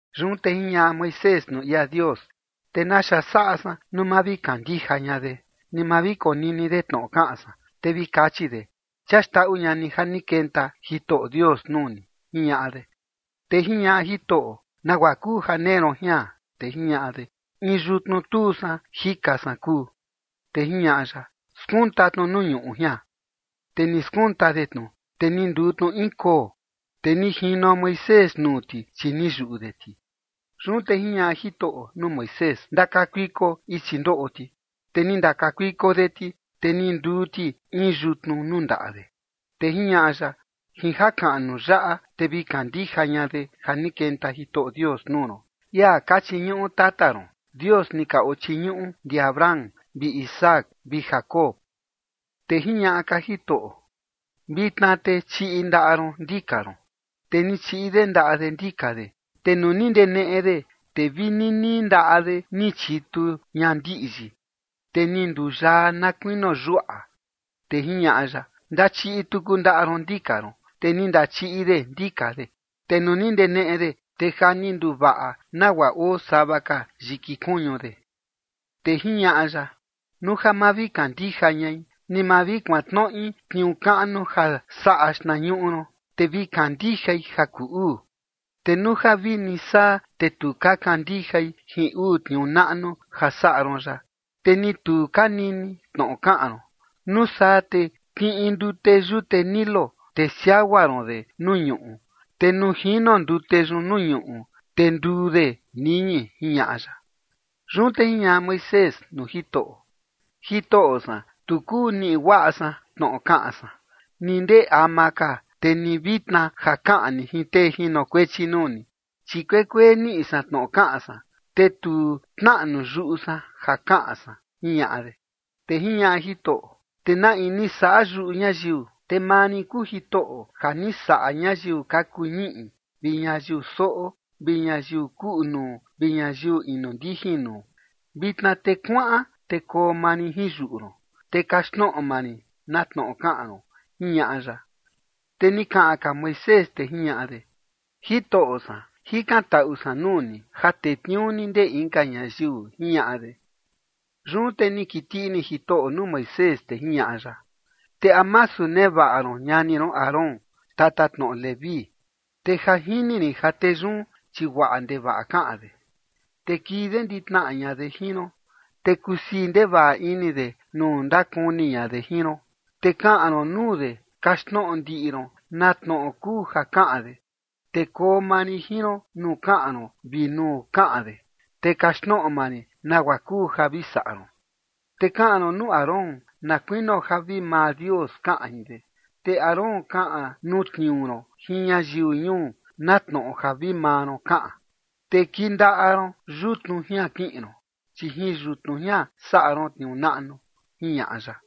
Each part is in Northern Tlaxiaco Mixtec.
Yun te jiñaꞌa Moisés nuu ia Dios: ―Te ¿naxa saꞌa san nuu ma vi kandija ña de, ni ma vi konini de tnoꞌo kaꞌan san? Te vi kachi de: “Chia xndaꞌu ña ni ja ni kenta Jitoꞌo Dios nuu ni” ―jiñaꞌa de. Te jiñaꞌa Jitoꞌo: ―¿Nagua kuu ja nee ron jian? Te jiñaꞌa de: ―In yutnu tuu san jika san kuu. Te jiñaꞌa ya: ―Skunta tnu nuu ñuꞌu jian. Te ni skunta de tnu, te ni nduu tnu in koo, te ni jino Moisés nuu ti, chi ni yuꞌu de ti. Yun te jiñaꞌa Jitoꞌo nuu Moisés: ―Ndakakuiko ichi ndoꞌo ti. Te ni ndakakuiko de ti, te ni nduu ti in yutnu nuu ndaꞌa de. Te jiñaꞌa ya: ―Jin jakaꞌnu yaꞌa, te vi kandija ña de ja ni kenta Jitoꞌo Dios nuu ron, ia ka chiñuꞌu tata ron, Dios ni ka ochiñuꞌu ndi Abraham vi Isaac vi Jacob. Te jiñaꞌa ka Jitoꞌo: ―Vitna te chiꞌi ndaꞌa ron ndika ron. Te ni chiꞌi de ndaꞌa de ndika de, te nuu ni ndeneꞌe de, te vi ninii ndaꞌa de ni chitu ña ndiꞌyi, te ni nduyaa na kuinio yuaꞌa. Te jiñaꞌa ya: ―Ndachiꞌi tuku ndaꞌa ron ndika ron. Te ni ndachiꞌi de ndika de, te nuu ni ndeneꞌe de, te ja ni nduvaꞌa nagua oo sava ka yiki kuñu de. Te jiñaꞌa ya: ―Nuu ja ma vi kandija ñai, ni ma vi kuantnoꞌi tniuu kaꞌnu ja saꞌa xtnañuꞌu ron, te vi kandijai ja kuu uu. Te nuu ja vini saa, te tu ka kandijai jin uu tniuu naꞌnu ja saꞌa ron yaꞌa, ni tu ka nini tnoꞌo kaꞌan ron, nuu saa te kiꞌin ndute yute Nilo, te siagua ron de nuu ñuꞌu, te nuu jino ndute yun nuu ñuꞌu, te nduu de niñi ―jiñaꞌa ya. Yun te jiñaꞌa Moisés nuu Jitoꞌo: ―Jitoꞌo san, tu kuu niꞌi guaꞌa san tnoꞌo kaꞌan san, ni ndee ama ka, te ni vitna ja kaꞌan ni jin tee jinokuechi nuu ni, chi kuekuee niꞌi san tnoꞌo kaꞌan san, te tu tnaꞌnu yuꞌu san ja kaꞌan san ―jiñaꞌa de. Te jiñaꞌa Jitoꞌo: ―¿Te na in ni saꞌa yuꞌu ñayiu? Te maa rin kuu Jitoꞌo ja ni saꞌa ñayiu ka kuu ñiꞌi vi ñayiu soꞌo vi ñayiu kuꞌu nuu vi ñayiu inu ndijin nuu. Vitna te kuaꞌan te koo maa rin jin yuꞌu ron, te kaxtnoꞌo maa rin na tnoꞌo kaꞌan ron ―jiñaꞌa ya. Te ni kaꞌan ka Moisés, te jiñaꞌa de: ―Jitoꞌo san, jikantaꞌu san nuu ni ja tetniuu ni ndee inka ñayiu ―jiñaꞌa de. Yun te ni kiti ini Jitoꞌo nuu Moisés, te jiñaꞌa ya: ―¿Te a masu nevaꞌa ron ñani ron Aarón, tatatnoꞌo Leví? Te ja jini rin ja tee yun, chi guaꞌa ndevaꞌa kaꞌan de. Te kii de nditnaꞌa ña de jin ron, te kusii ndevaꞌa ini de nuu ndakuni ña de jin ron. Te kaꞌan ron nuu de, kaxtnoꞌo ndiꞌi ron na tnoꞌo kuu ja kaꞌan de, te koo maa rin jin ron nuu kaꞌan ron vi nuu kaꞌan de, te kaxtnoꞌo maa rin nagua kuu ja vi saꞌa ron. Te kaꞌan ron nuu Aarón na kuinio ja vi maa Dios kaꞌan jin de, te Aarón kaꞌan nuu tniuu ron jin ñayiu ñuu na tnoꞌo ja vi maa ron kaꞌan. Te kindaꞌa ron yutnu jian kiꞌin ron, chi jin yutnu jian saꞌa ron tniuu naꞌnu ―jiñaꞌa ya.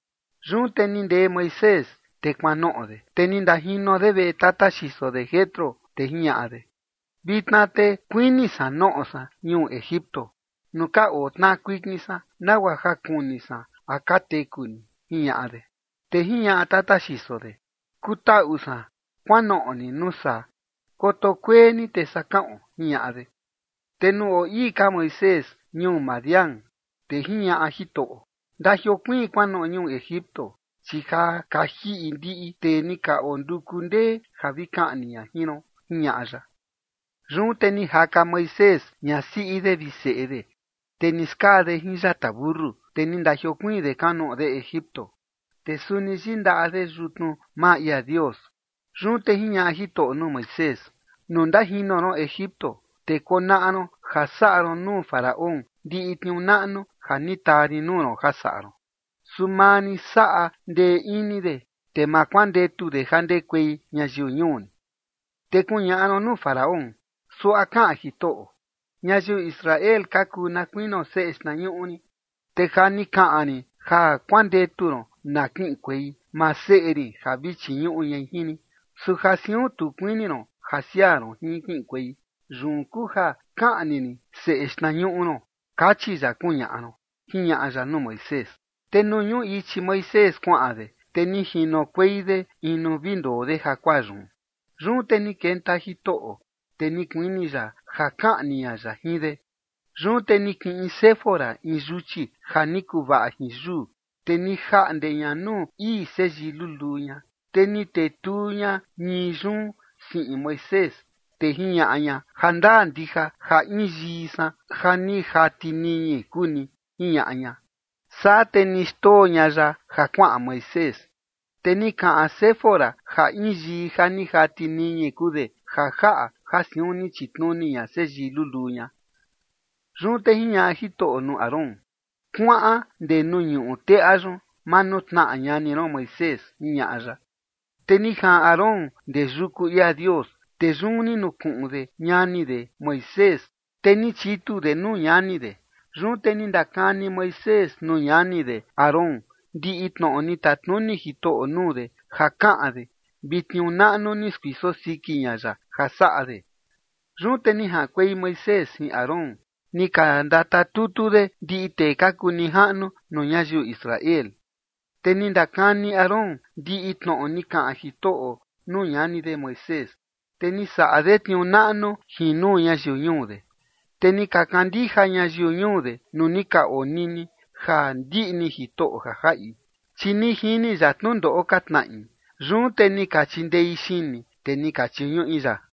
Yun te ni ndee Moisés te kuanoꞌo de, te ni ndajino de veꞌe tata xiso de Jetro, te jiñaꞌa de: ―Vitna te kuini san noꞌo san ñuu Egipto nuu ka oo tnaꞌa kuikin san, nagua ja kuni san a ka teku ni ―jiñaꞌa de. Te jiñaꞌa tata xiso de: ―Kutaꞌu san, kuanoꞌo ni nuu saa, koto kuee ni, te saa kaꞌon ―jiñaꞌa de. Te nuu oo ii ka Moisés ñuu Madián, te jiñaꞌa Jitoꞌo: ―Ndajiokuiin kuanoꞌo ñuu Egipto, chi ja ni ka jiꞌi ndiꞌi tee ni ka onduku ndee ja vi kaꞌni ña jin ron ―jiñaꞌa ya. Yun te ni jaka Moisés ñasiꞌi de vi seꞌe de, te ni skaa de jin yata mentu, te ni ndajiokuiin de kuanoꞌo de Egipto. Te suni yindaꞌa de yutnu maa ia Dios. Yun te jiñaꞌa Jitoꞌo nuu Moisés: ―Nuu ndajino ron Egipto, te konaꞌa ron ja saꞌa ron nuu Faraón ndiꞌi tniuu naꞌnu ja ni taa rin nuu ron ja saꞌa ron. Su maa rin saꞌa ndee ini de, te ma kuandetu de ja ndekuei ñayiu ñuu rin. Te kuñaꞌa ron nuu Faraón: “Suaꞌa kaꞌan Jitoꞌo: Ñayiu Israel ka kuu na kuinio seꞌe xtnañuꞌu rin. Te ja ni kaꞌan rin ja kuandetu ron na kiꞌinkuei maa seꞌe rin ja vi chiñuꞌu ñai jin rin. Su ja siun tu kuini ron ja siaa ron jin kiꞌinkuei, yun kuu ja kaꞌni rin seꞌe xtnañuꞌu ron, kachi ya”, kuñaꞌa ron ―jiñaꞌa ya nuu Moisés. Te nuu ñuꞌu ichi Moisés kuaꞌan de, te ni jinokuei de in nuu vi ndoo de jakuaa yun. Te yun ni kenta Jitoꞌo, te ni kuini ya ja kaꞌni ña ya jin de. Yun te ni kiꞌin Séfora in yuchi ja ni kuvaꞌa jin yuu, te ni jaꞌnde ña nuu ii seyii luluu ña, te ni tetuu ña ñii yun siꞌin Moisés, te jiñaꞌa ña: ―Jandaa ndija ja in yii san ja ni jati niñi kuu ni ―jiñaꞌa ña. Saa te ni xndoo ña ya ja kuaꞌan Moisés. Te ni kaꞌan Séfora ja in yii ja ni jati niñi kuu de ja jaꞌa ja siun ni chitnuni ña seyii luluu ña. Yun te jiñaꞌa Jitoꞌo nuu Aarón: ―Kuaꞌan ndee nuu ñuꞌu teꞌa yun manutnaꞌa ñani ron Moisés ―jiñaꞌa ya. Te ni jaꞌan Aarón ndee yuku ia Dios, te yun ni nukuꞌun de ñani de Moisés. Te ni chitu de nuu ñani de. Yun te ni ndakani Moisés nuu ñani de Aarón ndiꞌi tnoꞌo ni tatnuni Jitoꞌo nuu de ja kaꞌan de vi tniuu naꞌnu ni skuiso siki ña ya ja saꞌa de. Yun te ni jaꞌankuei Moisés jin Aarón, ni ka ndatatutu de ndiꞌi tee ka kuu nijaꞌnu nuu ñayiu Israel. Te ni ndakani Aarón ndiꞌi tnoꞌo ni kaꞌan Jitoꞌo nuu ñani de Moisés. Te ni saꞌa de tniuu naꞌnu jin nuu ñayiu ñuu de. Te ni ka kandija ñayiu ñuu de nuu ni ka onini ja ndiꞌni Jitoꞌo ja jaꞌi, chi ni jini ya tnundoꞌo ka tnaꞌi. Yun te ni ka chindei xini, te ni ka chiñuꞌi ya.